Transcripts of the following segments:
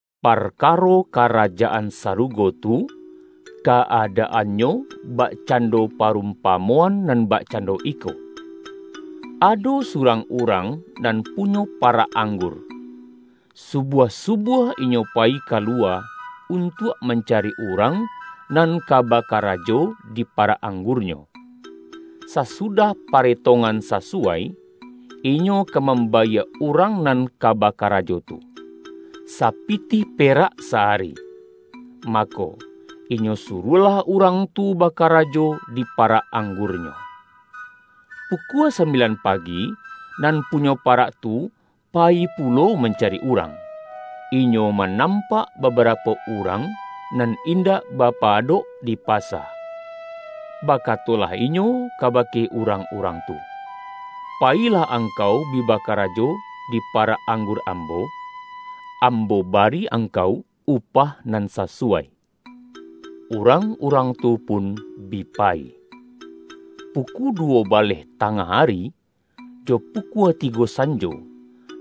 ”Parkaro Karajaan Sarugo tu, ka-adaannyo bakcando parum-pamoan nan bakcando iko: Ado su-rang urang nan punyo parak anggur, subuah-subuah inyo payi kaluwa, un-tuak mancari urang nan ka bakarajo di parak anggurnyo. Sasudah pare-tongan sasuwai, inyo ka mambayie urang nan ka bakarajo tu, sapitih pe-rak sa-ari, mako, inyo suruahlah urang tu bakarajo di parak anggurnyo. Pu-kua sambilan pagi, nan punyo parak tu payi pulo mancari urang, inyo ma-nampak babarapo urang nan indak bapa-adok di pasa. Bakatolah inyo kabake urang-urang tu, ’Payilah ang-kau bi bakarajo di parak anggur am-bo. Ambo bari angkau upah nan sa-suwai.’ Urang-urang tu pun bi payi. Pukua duwo baleh tangah ari, jo pu-kua tigo sanjo,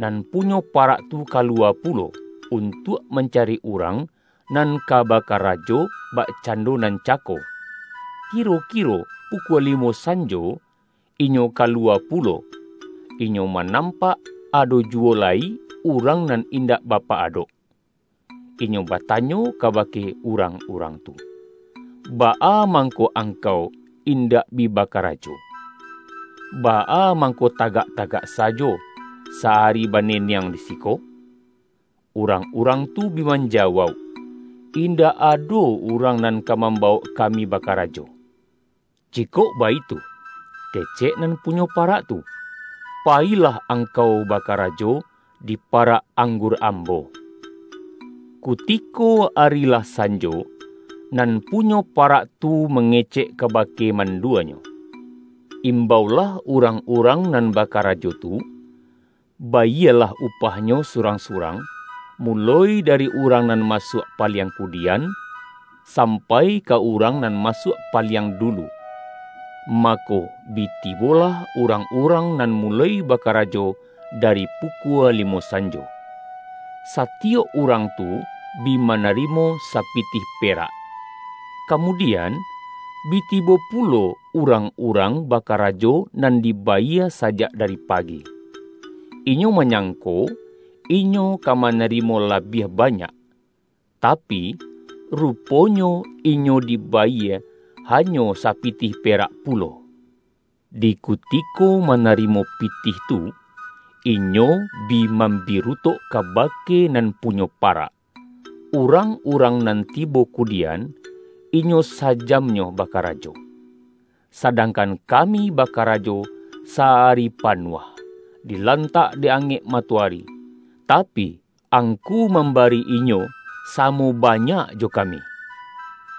nan punyo parak tu kaluwa pulo, untuak mancari urang nan ka bakarajo bakcando nan cako. Kiro-kiro pukua limo sanjo, inyo ka-luwa pulo, inyo manampak, ado juwo lai urang nan indak bapa-adok. Inyo batanyo kabake urang-urang tu, ’Baa mangko angkau indak bi bakarajo, baa mangko tagak-tagak sajo sa-ari baneneng di siko?' Urang-urang tu bi manjawauk, ’Indak ado urang nan ka mambawok kami bakarajo.’ ’Jikok baitu.’ kecek nan punyo parak tu, ’pa-yilah angkau bakarajo di parak ang-gur ambo.’ Kutiko arilah sanjo, nan punyo pa-rak tu mangecek kabake manduanyo, Imbaulah urang-urang nan bakarajo tu, bayielah upahnyo surang-surang, muloi dari urang nan masuak paliang kudian, sampai ka urang nan masuak paliang dulu.’ Mako, bi tibolah urang-urang nan muloi bakarajo dari pukua limo san-jo. Satiyok urang tu bi manarimo sa-pitih perak. Kamudian, bi tibo pulo urang-urang bakarajo nan dibayie sa-jak dari pagi. Inyo manyangko, inyo ka manarimo labiah banyak. Tapi, rupo-nyo inyo dibayie hanyo sapitih perak pulo. Di kutiko manarimo pitih tu, inyo bi mambirutok kabake nan punyo parak: ’Urang-urang nan tibo kudi-an, inyo sajamnyo bakarajo. Sadang-kan kami bakarajo sa-ari panuah, di-lantak dek angek matoari, tapi, angku mambari inyo samo banyak jo kami!’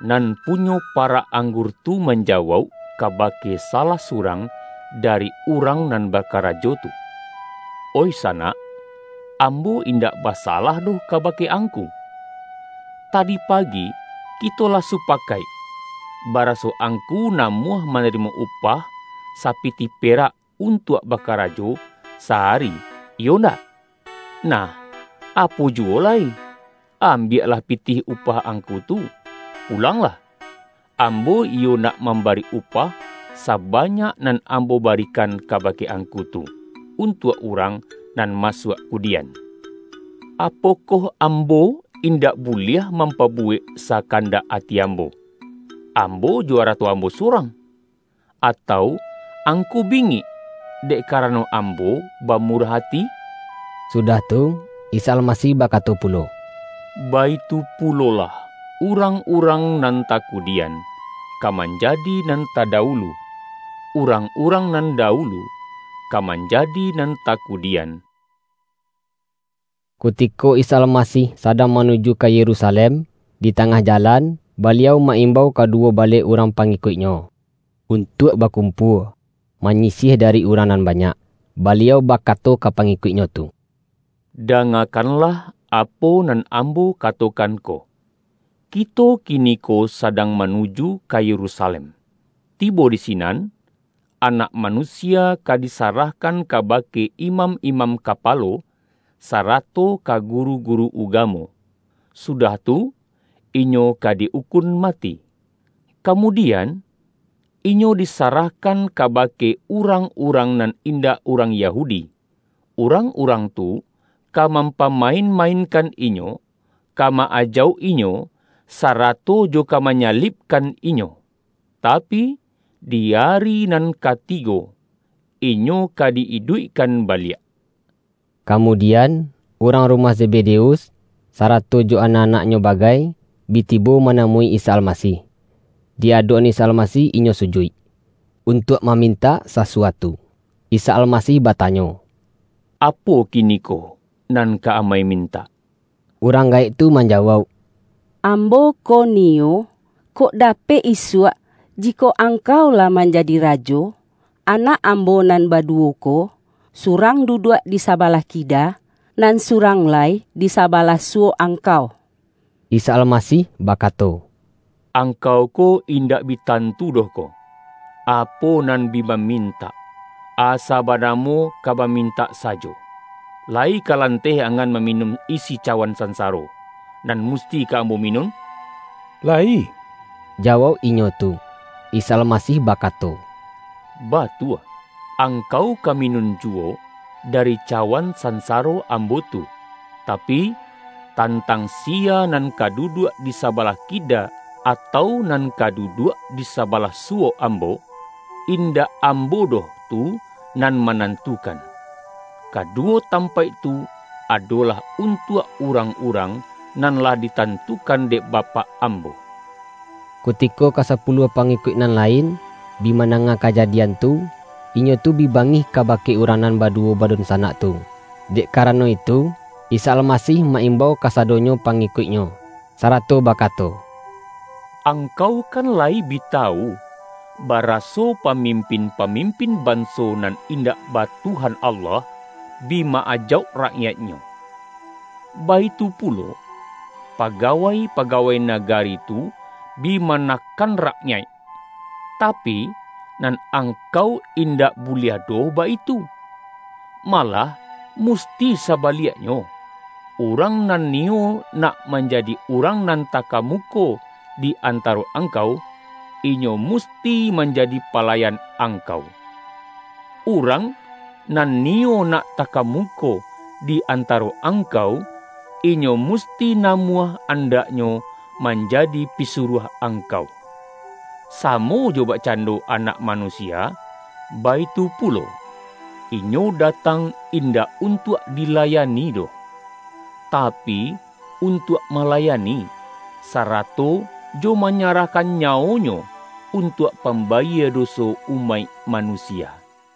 Nan punyo parak anggur tu manja-wauk, kabake salah surang dari urang nan bakarajo tu, ’Oih sanak, ambo in-dak basalah doh kabake angku. Tadi pagi kito lah supakaik, baraso angku namuah manarimo upah sapitih pe-rak untuak bakarajo sa-ari, iyo ndak? Nah, apo juwo lai, ambiaklah pitih upah angku tu, pulanglah. Ambo iyo nak mambari upah, sabanyak nan am-bo barikan kabake angku tu, untuak urang nan masuak kudian. Apokoh ambo indak buliah, mampabuwek sa-kandak ati ambo, ambo jo arato ambo sorang? Atau angku bingik, dek kara-no ambo bamurah ati?'” Sudah tu, Isa Almasih bakato pu-lo,”Baitu pulolah urang-urang nan takudian, ka manjadi nan tadawulu, urang-urang nan dawulu, ka manja-di nan takudian.” Kutiko Isa Almasih sadang manuju ka Yerusalem, di tangah jalan, Baliau ma-imbau kaduwo baleh urang pangi-kuik-Nyo, untuak bakumpua, manyi-siah dari urang nan banyak. Baliau bakato ka pangikuik-Nyo tu, ”Da-ngakanlah apo nan Ambo katokan ko! Kito kiniko sadang manuju ka Yerusa-lem. Tibo di sinan, Anak Manusia ka disarahkan kabake imam-imam kapa-lo, sarato ka guru-guru ugamo. Sudah tu, Inyo ka di ukun mati, kamudian, Inyo disarahkan kabake urang-urang nan indak urang Yahudi. Urang-urang tu ka mampamain-mainkan Inyo, ka ma-ajauk Inyo, sarato jo ka manyalib-kan Inyo. Tapi, di ari nan katigo, Inyo ka di iduikkan baliak.” Kamudian, urang rumah Zebede-us, sarato jo anak-anaknyo bagai, bi tibo manamui Isa Almasih. Di adok-an Isa Almasih inyo sujuik, untuak mamintak sasuatu. Isa Almasih batanyo,”Apo kini-ko nan ka amai mintak.” Urang gaek tu manjawauk,”Ambo ko niyo, kok dapek isuak, jikok Angkau lah manjadi Rajo, anak ambo nan baduwo ko, surang duduak di sabalah kida, nan surang lai di sabalah suwok Angkau.” Isa Almasih bakato,”Angkau ko indak bi tantu doh ko, apo nan bi ba-mintak, asa banamo ka bamintak sa-jo, layi ka lanteh angan maminun isi cawan sansaro, nan musti ka Ambo minun?””Layi,” jawauk inyo tu. Isa Almasih bakato,”Batua, ang-kau ka minun juwo dari cawan sansa-ro Ambo tu. Tapi, tantang siya nan ka duduak di sabalah kida, atau nan ka duduak di sabalah suwok Ambo, in-dak Ambo doh tu nan manantukan. Kaduwo tampaik tu adolah untuak urang-urang nan lah ditantukan dek Bapak Ambo.” Kutiko ka sapuluah pangikuik nan lain, bi mandanga kajadian tu, inyo tu bi bangih kabake urang nan baduwo badunsanak tu. Dek karano itu, Isa Almasih ma-imbau kasadonyo pangi-kuik-Nyo, sarato bakato,”Angkau kan layi bi tawu, baraso pamimpin-pamim-pin banso nan indak ba Tuhan Allah, bi ma-ajauk rakyaiknyo. Baitu pulo, pa-gawai-pagawai nagari tu bi manakan rakyaik. Tapi, nan angkau indak bu-liah doh baitu. Malah musti sabaliak-nyo, urang nan niyo nak manjadi urang nan takamuko di antaro angkau, inyo musti manjadi palayan angkau. Urang nan niyo nak takamuko di antaro angkau, inyo musti namuah andaknyo manjadi pisuruah angkau. Samo jo bakcando Anak Manusia, baitu pulo; Inyo datang indak untuak dilayani doh, tapi, untuak malayani, sa-rato jo manyarahkan nyawo-Nyo, un-tuak pambayie doso umaik manusia.”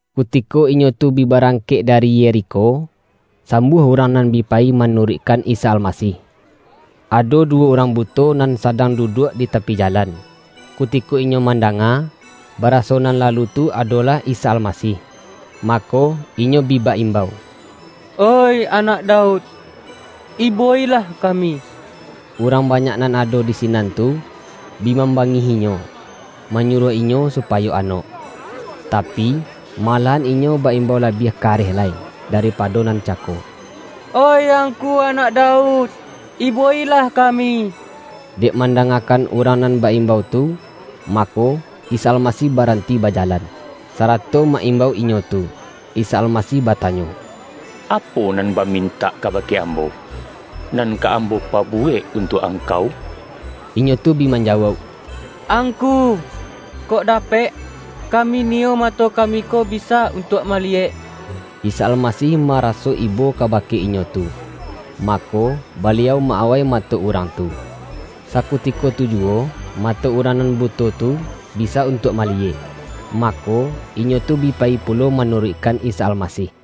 Kutiko inyo tu bi barangkek dari Yerikho, sambuah urang nan bi payi manuruikkan Isa Almasih. Ado du-wo urang buto nan sadang duduak di tapi jalan. Kutiko inyo mandanga, ba-raso nan lalu tu adolah Isa Almasih, mako, inyo bi ba-imbau,”Oih Anak Daud, ibo-ilah kami!” Urang banyak nan ado di sinan tu, bi mambangih-inyo, manyuruah inyo supayo anok. Tapi, malahan inyo ba-imbau labiah kareh lai, daripado nan cako,”Oih Angku, Anak Daud, ibo-ilah kami!” Dek mandangakan urang nan ba-imbau tu, mako, Isa Almasih baranti bajalan, sarato ma-imbau inyo tu. Isa Almasih batanyo,”Apo nan bamintak kabake Ambo, nan ka Ambo pabuwek untuak angkau?” Inyo tu bi manjawauk,”Angku, kok dapek, kami niyo mato kami ko bisa untuak maliyek!” Isa Almasih maraso ibo kabake inyo tu, mako, Baliau ma-awai ma-to urang tu. Sakutiko tu juwo, mato urang nan buto tu, bisa untuak mali-yek. Mako, inyo tu bi payi pulo ma-nuruikkan Isa Almasih.